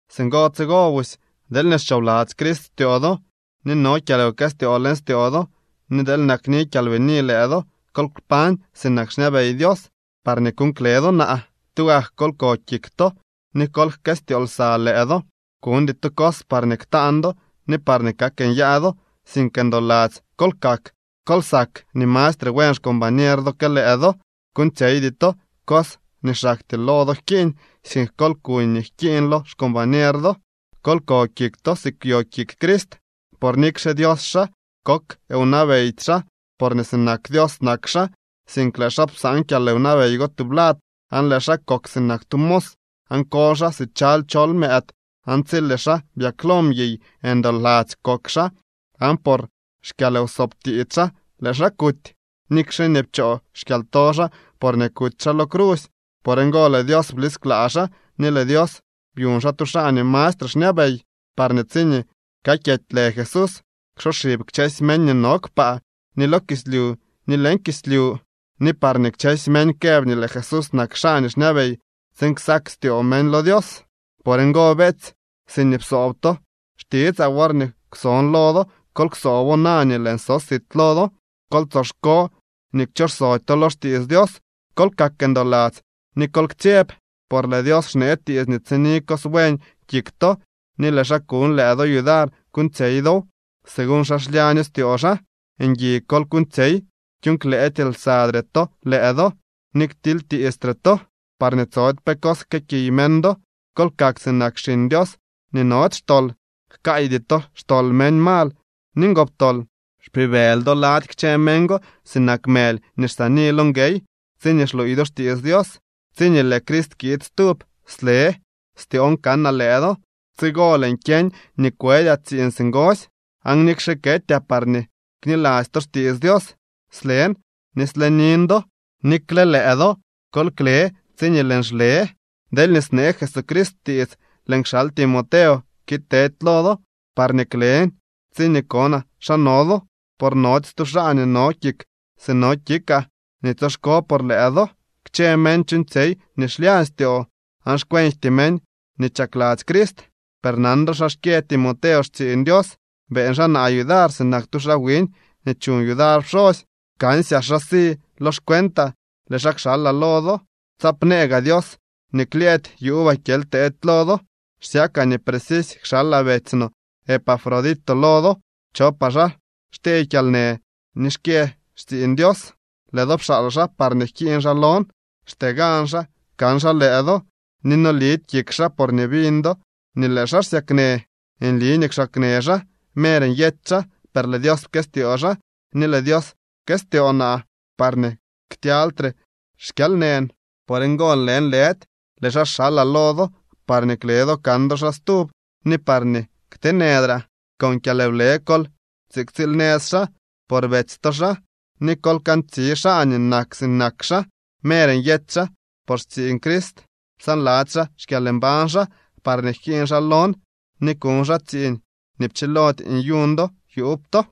Singo tsigo busy deelñee xchoobladzy Crist styoo do, ni no kyalwkëstyoo leñ styoo do, ni deel nakni kyalbini lëë do, kol kpañ sinak xñabey Dios, parñee kuuñ kle do naa. Tugak kol ko kik to, ni kol jkëstyoo lsa lëë do. Kuñdy to cos parñee ktaan do ni parñee kak nyaa do, sink ndoladzy kol kak. Kol sak nii mastre buen xcombañer do que lëë do. Kuuñtsyeydy to cos nii xaktyee lo do jkiiñ, sink kol kuñ nii jkiiñ lo xcombañer do. Kol ko kik to si kwyo kik Crist. Por nikxe Dios xaa, kok wnabeydy xaa porñee sinak Dios nak xaa, sink lëë xaa psaan kyalwnabey go tublad aan lëë xaa kok sinak tu mos, aan koly xaa si chaly chol mëëd. Aan tsi lëë xaa byaklo mguiy, ndoladzy kok xaa aan por xkyalwsoob tiits xaa lëë xaa kuty, nikxe nii pchoo xkyalto xaa porñee kuty xaa lo crusy. Por ngo lëë Dios blisklaa xaa ni lëë Dios byuñ xaa tu xaa nii mastre xñabey, parñee tsiñee kakyety lë Jesús, ksoxib kchësy meñ nii no kpaa, ni lo kislyu ni leñ kislyu, ni parñee kchësy meñ këb nii lëë Jesús nak xaa nii xñabey tsiin ksak styoo meñ lo Dios. Por ngo, beetsy, siñee psoob to xtitsaa worñee kwson lo do, kol ksoobo na nii lëën so sit lo do. Kol tsoxko nii kchoxsody to lo xtiits Dios, kol kak ndoladzy ni kol ktsyeb. Por lëë Dios xnee tiits nii tsini cos buen kik to ni lëë xaa kuñ lëë do yudar kuuñtsyey dow, según xa klyaño styoo xaa. Ngui kol kuuñtsyey kyuuñklëëdy lsadre to lëë do ni ktilytiistre to, parñee tsody pe cos jkëëkiy meñ do. Kol kak sinak xiñ Dios nii nody xtol, jkaaydy to xtol meñ mal ni ngoptol. Xpibëly do lady kchë meñ go sinak mëly nii xsaani lo nguey, tsiñee xluuy do xtiits Dios. Tsiñee lëë Crist kiid stub sle styoon kanaa lëë do. Tsigo lëën kyeñ nii kwëdyaa tsiiñ singosy. Aan nikxe ketyaa parñee kniladzy to xtiits Dios, slen ni slenin do. Nikle lëë do kol kle tsiñee lëën xle. Deelñee snee Jesucrist tiits lëën kxal Timoteo kiid tedy lo do, parñee klen tsiñee konaa xa no do. Por nody stu xaa nii no kik si no kikaa ni tsoxko por lëë do. Kchë meñ chuuñtsyey nii xlyañ styoo aan xkwenjty meñ nii chakladzy Crist. Per nan do xa xkyë Timoteo xtsiiñ Dios. Beeñ xaa naa yudar sinak tu xaa wiñ nii chuñ yudar pxosy. Kansyaa xa si lo xcuentaa lëë xaa kxalaa lo do, tsaapnëë gaa Dios nii klyëëdy yuubaa kyely teedy lo do. Xsyakaa nii precisy kxalaa betsy no Epafrodito lo do. Chopaa xaa xtyee kyalnë ni xkyë xtsiiñ Dios. Lëë do pxaal xaa parñee jkiiñ xaa lon. Xtee gan xaa kan xaa lëë do, ni nolidy kik xaa porñee biñ do nii lëë xaa xsyaknë. Nli nii kwxaaknë xaa, mer nyety xaa. Per lëë Dios pkëstyoo xaa ni lëë Dios pkëstyoo naa, parñee ktyalytre xkyalnën. Por ngo lëënlëdy lëë xaa xalaa lo do parñee kle do kan do xaa stub ni parñee kteenëdraa. Con kyalwle kol tsiktsiil nëz xaa, por betsy to xaa, ni kol kantsi xaa nii nak sinak xaa. Mer nyety xaa por xtsiiñ Crist. Psaanladzy xaa xkyalmbañ xaa parñee jkiiñ xaa lon ni kuñ xaa tsiiñ nii pchilody nyuñ do yuub to.